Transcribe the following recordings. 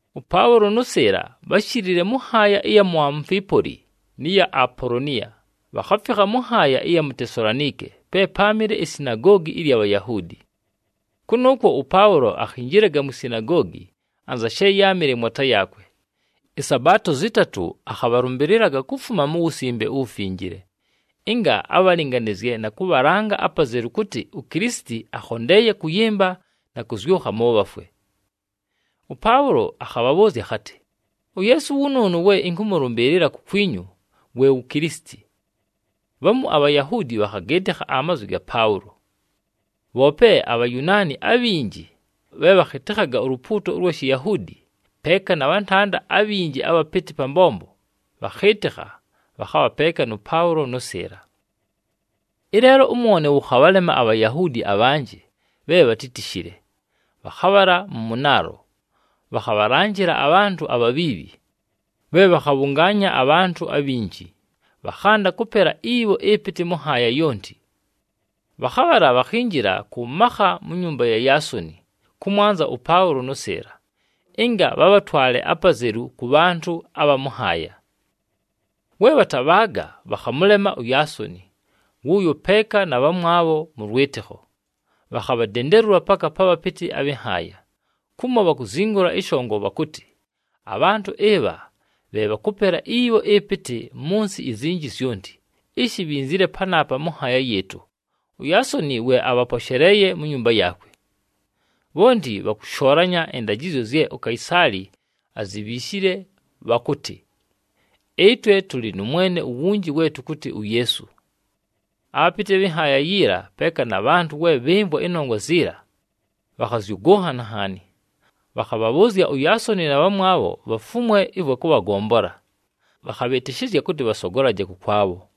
ɄPaʉlo nʉ Sɨɨla bháshilile mʉ nhaaya ɨya mu Amufipooli, nɨ ya Apoloniya, bhakhafikha mʉ nhaaya ɨya mu Tesalonike pe páamɨle isinagoogi ɨlya Bhayahuudi. Kʉnʉʉkwo ʉPaʉlo akhinjilaga mwi sinagoogi, anza she yáamɨle mwata yaakwe. ƗSabaato zɨtatʉ akhabhalʉmbɨlɨlaga kufuma mu Wusimbe uWufinjile, ɨnga abhalɨnganɨzye na kʉbhalanga apazelu kʉtɨ uKilisiti akhondeeye kʉyɨmba na kʉzyʉkha mʉ bhafwe. ɄPaʉlo akhabhabhʉʉzya akhatɨ, “UYeesu wʉnʉʉnʉ we ɨnkʉmʉlʉmbɨɨlɨla kukwinyu we wu Kilisiti.” Bhamu aBhayahuudi bhakhagɨɨtɨkha amazwi ga Paʉlo. Bhoope aBhayunaani abhinji bhe bhakhɨtɨkhaga ulupuuto ʉlwa Shiyahuudi, peeka na bhantanda abhinji abhapɨtɨ pa mbombo, bhakhɨɨtɨkha, bhakhabha peeka nʉ Paʉlo nʉ Sɨɨla. Ɨleelo ʉmwone wʉkhabhalema aBhayahuudi abhanjɨ bhe bhatítishile, bhakhabhala mʉ mʉnaalo, bhakhabhalanjɨla abhantʉ abhabhiibhi, bhe bhakhabhʉngaanya abhantʉ abhinji, bhakhanda kʉpela ibho ɨpɨtɨ mʉ nhaaya yonti. Bhakhabhala bhakhinjila kʉ makha mu nyumba ya Yaasoni kʉmwanza ʉPaʉlo nʉ Sɨɨla, ɨnga bhabhatwale apazelu kʉ bhantʉ abha mʉ nhaaya. We bhatabhaaga, bhakhamʉlema uYaasoni wʉʉyo peeka na bhamwabho bhamu mʉ lwɨtɨkho, bhakhabhadendelula paka pa bhapɨtɨ abhɨ nhaaya, kumo bhakuzingula ɨshongo bhakʉtɨ, “Abhantʉ ɨbha bhe bhakʉpela ibho ɨpɨtɨ mʉ nsɨ izinji zyonti, ishi bhinzile panaapa mʉ nhaaya yɨɨtʉ, uYaasoni we abhaposheleeye mu nyumba yaakwe. Bhonti bhakʉshoolanya ɨndajɨzyo zye uKaisaali azibhiishile bhakʉtɨ, ‘Ɨtwe tʉlɨ nʉ mwene uwunji we tʉkʉtɨ uYeesu.’” Abhapɨtɨ abhɨ nhaaya yiila peeka na bhantʉ we bhɨmvwa ɨnongwa ziila, bhakhazyʉgʉnhana nhaani. Bhakhabhabhʉʉzya uYaasoni na bhamwabho bhafumwe ɨvwa kʉbhagombola, bhakhabhɨtɨshɨzya kʉtɨ bhasogolaje kʉkwabho.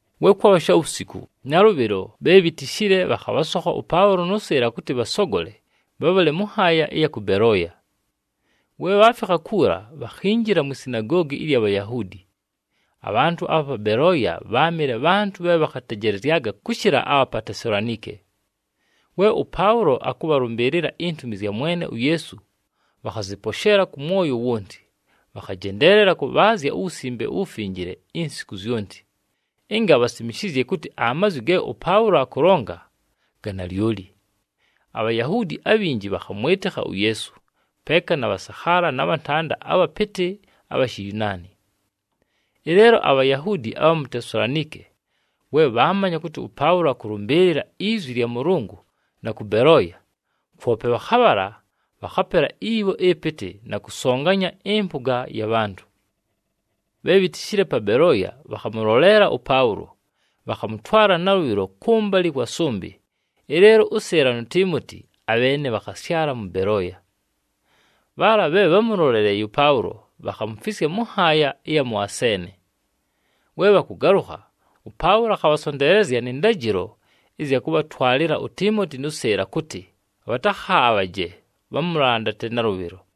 We kwabha shawusiku, nalʉbhɨlo bhe bhitishile bhakhabhasokha ʉPaʉlo nʉ Sɨɨla kʉtɨ bhasogole bhabhale mʉ nhaaya ɨya kʉ Belooya. We bhaafikha kuula, bhakhinjila mwi sinagoogi ɨlya Bhayahuudi. Abhantʉ abha pa Belooya bháamɨle bhantʉ bhe bhakhatejelezyaga kʉshɨla abha pa Tesalonike. We ʉPaʉlo akʉbhalʉmbɨɨlɨla intumi zya Mwene uYeesu, bhakhazɨposheela kʉ mwoyo wonti. Bhakhajendeelela kʉbhaazya uWusimbe uWufinjile insiku zyonti, ɨnga bhasimishizye kʉtɨ amazwi ge ʉPaʉlo akʉlonga ga nalyoli. ABhayahuudi abhinji bhakhamwɨtɨkha uYeesu, peeka na bhasakhaala na bhantanda abhapɨtɨ abha Shiyunaani. Ɨleelo aBhayahuudi abha mu Tesalonike, we bhaamanya kʉtɨ ʉPaʉlo akʉlʉmbɨɨlɨla izwi lya Mʉlʉngʉ na kʉ Belooya, kwope bhakhabhala, bhakhapela ibho ɨpɨtɨ na kʉsonganya ɨmpʉga ya bhantʉ. Bhe bhitishile pa Belooya bhakhamʉloleela ʉPaʉlo, bhakhamʉtwala nalʉbhɨlo kʉmbalɨ kwa sʉmbɨ, ɨleelo ʉSɨɨla nu Tiimoti abheene bhakhasyala mʉ Belooya. Bhaala bhe bhámʉloleleeye ʉPaʉlo bhakhamufisya mʉ nhaaya ɨya mʉ Aseene. We bhakʉgalʉkha, ʉPaʉlo akhabhasonteelezya nɨ ndajɨlo ɨzya kʉbhatwalɨla uTiimoti nʉ Sɨɨla kʉtɨ bhatakhaabhaje, bhamʉlandate nalʉbhɨlo.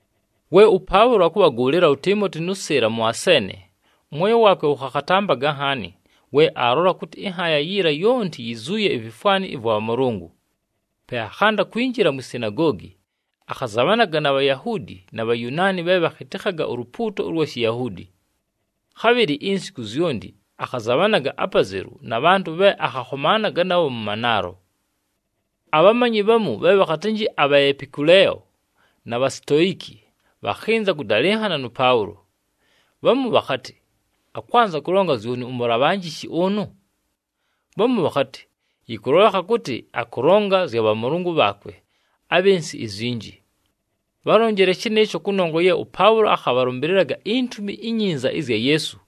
We ʉPaʉlo akʉbhagʉʉlɨla uTiimoti nʉ Sɨɨla mʉ Aseene, ʉmwoyo waakwe wʉkhakhatampaga nhaani we aalola kʉtɨ ɨnhaaya yiila yonti yizuuye ivifwani ɨvwa bhamʉlʉngʉ. Pe akhanda kwinjila mwi sinagoogi, akhazabhanaga na Bhayahuudi na Bhayunaani bhe bhakhɨtɨkhaga ulupuuto ʉlwa Shiyahuudi. Khabhɨlɨ insiku zyonti, akhazabhanaga apazelu na bhantʉ bhe akhakhomaanaga nabho mʉ manaalo. Abhamanyi bhamu bhe bhakhatɨnjɨ aBhaepikuleeyo na Bhasitoiki bhakhɨnza kʉdalɨnhana nʉ Paʉlo. Bhamu bhakhatɨ, “Akwanza kʉlonga zyoni umulabhanjishi ʉnʉ?” Bhamu bhakhatɨ, “Yɨkʉlolekha kʉtɨ akʉlonga zya bhamʉlʉngʉ bhaakwe abhɨ nsɨ izinji.” Bhálonjile shɨnɨɨsho, kʉnongwa ye ʉPaʉlo akhabhalʉmbɨlɨlaga iNtumi iNyinza ɨzya Yeesu,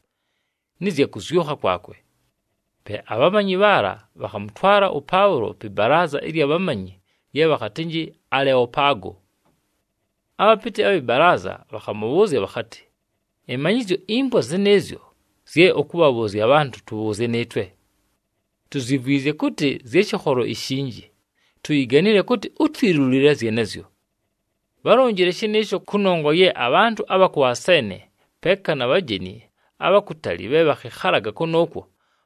nɨ zya kʉzyʉkha kwakwe. Pe abhamanyi bhaala bhakhamʉtwala ʉPaʉlo pɨ balaaza ɨlya bhamanyi lye bhakhatɨnjɨ Aleopago. Abhapɨtɨ abhɨ balaaza bhakhamʉbhʉʉzya bhakhatɨ, “Ɨmanyɨzyo impwa zɨnɨɨzyo zye ʉkʉbhabhʉʉzya abhantʉ, tʉbhʉʉzye nɨɨtwe. Tuzyimvwizye kʉtɨ zya shɨkholo ishinji, tuyiganile kʉtɨ utwilulile zyenezyo.” Bhálonjile shɨnɨɨsho, kʉnongwa ye abhantʉ abha kʉ Aseene, peeka na bhajeni abha kutali bhe bhakhɨkhalaga kʉnʉʉkwo,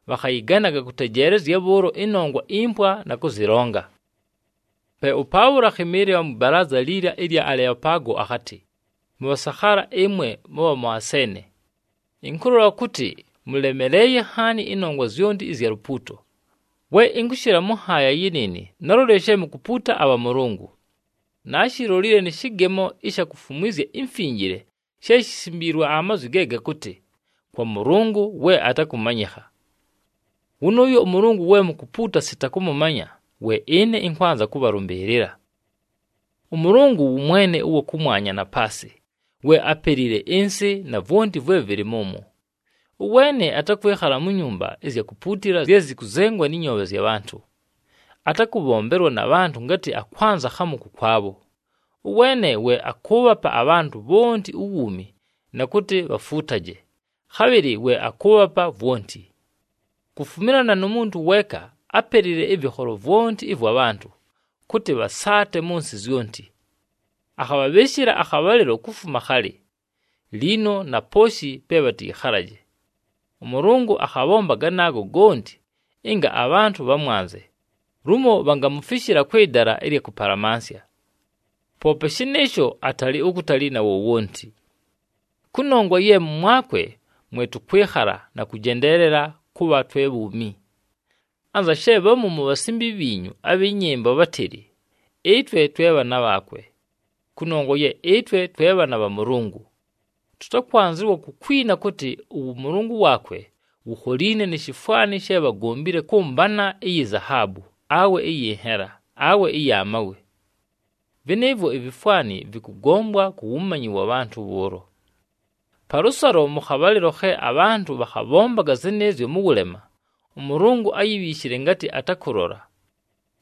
bhakhayɨganaga kʉtejeelezya bhʉʉlo ɨnongwa impwa, na kʉzɨlonga. Pe ʉPaʉlo akhɨmɨɨlɨla mwɨ balaaza liila ɨlya Aleopago, akhatɨ, “Mʉbhasakhaala ɨmwe mʉbha mʉ Aseene! Ɨnkʉlola kʉtɨ mʉlemeleeye nhaani ɨnongwa zyonti ɨzya lupuuto. We ɨnkʉshɨla mʉ nhaaya yɨnɨɨnɨ, nálolile she mukupuuta abhamʉlʉngʉ. Naashilolile nɨ shɨgemo ɨsha kufumwizya imfinjile she shisimbiilwe amazwi ge gakʉtɨ: KWA MɄLɄNGɄ WE ATAKɄMANYƗKHA. Wʉnʉʉyo ʉMʉlʉngʉ we mukupuuta sita kʉmʉmanya, we ɨne ɨnkwanza kʉbhalʉmbɨɨlɨla. “ɄMʉlʉngʉ wʉ Mwene ʉwa kʉmwanya na paasɨ, we ápelile ɨnsɨ, na vwonti vwe vɨlɨ mʉmwo. Ʉweene atakwɨkhala mu nyumba ɨzya kupuutila zye zɨkʉzengwa nɨ nyoobhe zya bhantʉ. Atakʉbhombelwa na bhantʉ ngatɨ akwanza khamu kʉkwabho. Ʉweene we akʉʉbhapa abhantʉ bhonti uwuumi na kʉtɨ bhafuutaje, khabhɨlɨ we akʉʉbhapa vwonti. Kufumilana nu muntu weeka ápelile ɨvɨkholo vwonti ɨvwa bhantʉ, kʉtɨ bhasaate mʉ nsɨ zyonti. Akhabhabhɨɨshɨla akhabhalɨlo kufuma khalɨ, liino na pooshi pe bhatɨyɨkhalaje. ɄMʉlʉngʉ akhabhomba ganaago gonti, ɨnga abhantʉ bhamwanze, lumo bhangamufishila kwɨ dala ɨlya kʉpalamansya. Poope shɨnɨɨsho, atalɨ ukutali na wowonti. ‘Kʉnongwa ye mʉmwakwe mwe tʉkwɨkhala na kʉjendeelela kʉbha twe bhuumi.’ Anza she bhamu mu bhasimbi bhiinyu abhɨ nyɨmbo bhátɨlɨ, ‘Ɨtwe twe bhaana bhaakwe.’ “Kʉnongwa ye ɨtwe twe bhaana bha Mʉlʉngʉ, tʉtakwanzɨwa kukwina kʉtɨ ʉwʉmʉlʉngʉ waakwe wukholiine ni shifwani she bhagombile kʉ mbana iyi zahaabu, awe ɨyɨ nhela, awe ɨya mawe. Vɨnɨɨvwo ivifwani vɨkʉgombwa ku wumanyi wa bhantʉ bhʉʉlo. Palʉsalo, mʉ khabhalɨlo khe abhantʉ bhakhabhombaga zɨnɨɨzyo mʉ wʉlema, ʉMʉlʉngʉ áyibhiishile ngatɨ atakʉlola.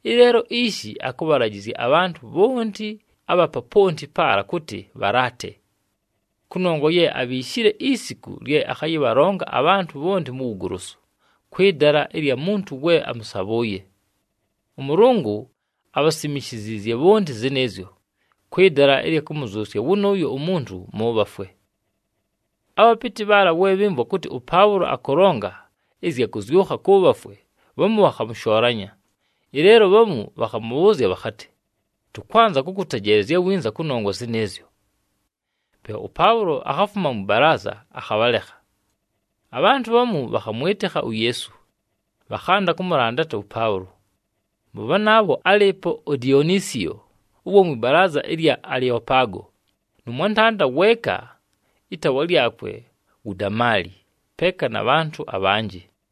Ɨleelo ishi akʉbhalajɨzya abhantʉ bhonti abha poponti paala kʉtɨ bhalaate. Kʉnongwa ye abhiishile isiku lye akhayɨbhalonga abhantʉ bhonti mu wugolosu, kwɨ dala ɨlya muntu we amʉsabhʉʉye. ɄMʉlʉngʉ abhasimishiziizye bhonti zɨnɨɨzyo, kwɨ dala ɨlya kʉmʉzyʉsya wʉnʉʉyo umuntu mʉ bhafwe.” Abhapɨtɨ bhaala, we bhɨmvwa kʉtɨ ʉPaʉlo akʉlonga ɨzya kʉzyʉkha kʉ bhafwe, bhamu bhakhamʉshoolanya. Ɨleelo bhamu bhakhamʉbhʉʉzya bhakhatɨ, “Tʉkwanza kʉkʉtejeelezya winza kʉnongwa zɨnɨɨzyo.” Pe ʉPaʉlo akhafuma mwɨ balaaza akhabhalekha. Abhantʉ bhamu bhakhamwɨtɨkha uYeesu, bhakhanda kʉmʉlandata ʉPaʉlo. Mʉ bhanaabho álɨɨpo uDionisiyo, ʉwa mwɨ balaaza ɨlya Aleopago, nʉ mwantanda weeka, ɨtaawa lyakwe wu Damali, peeka na bhantʉ abhanjɨ.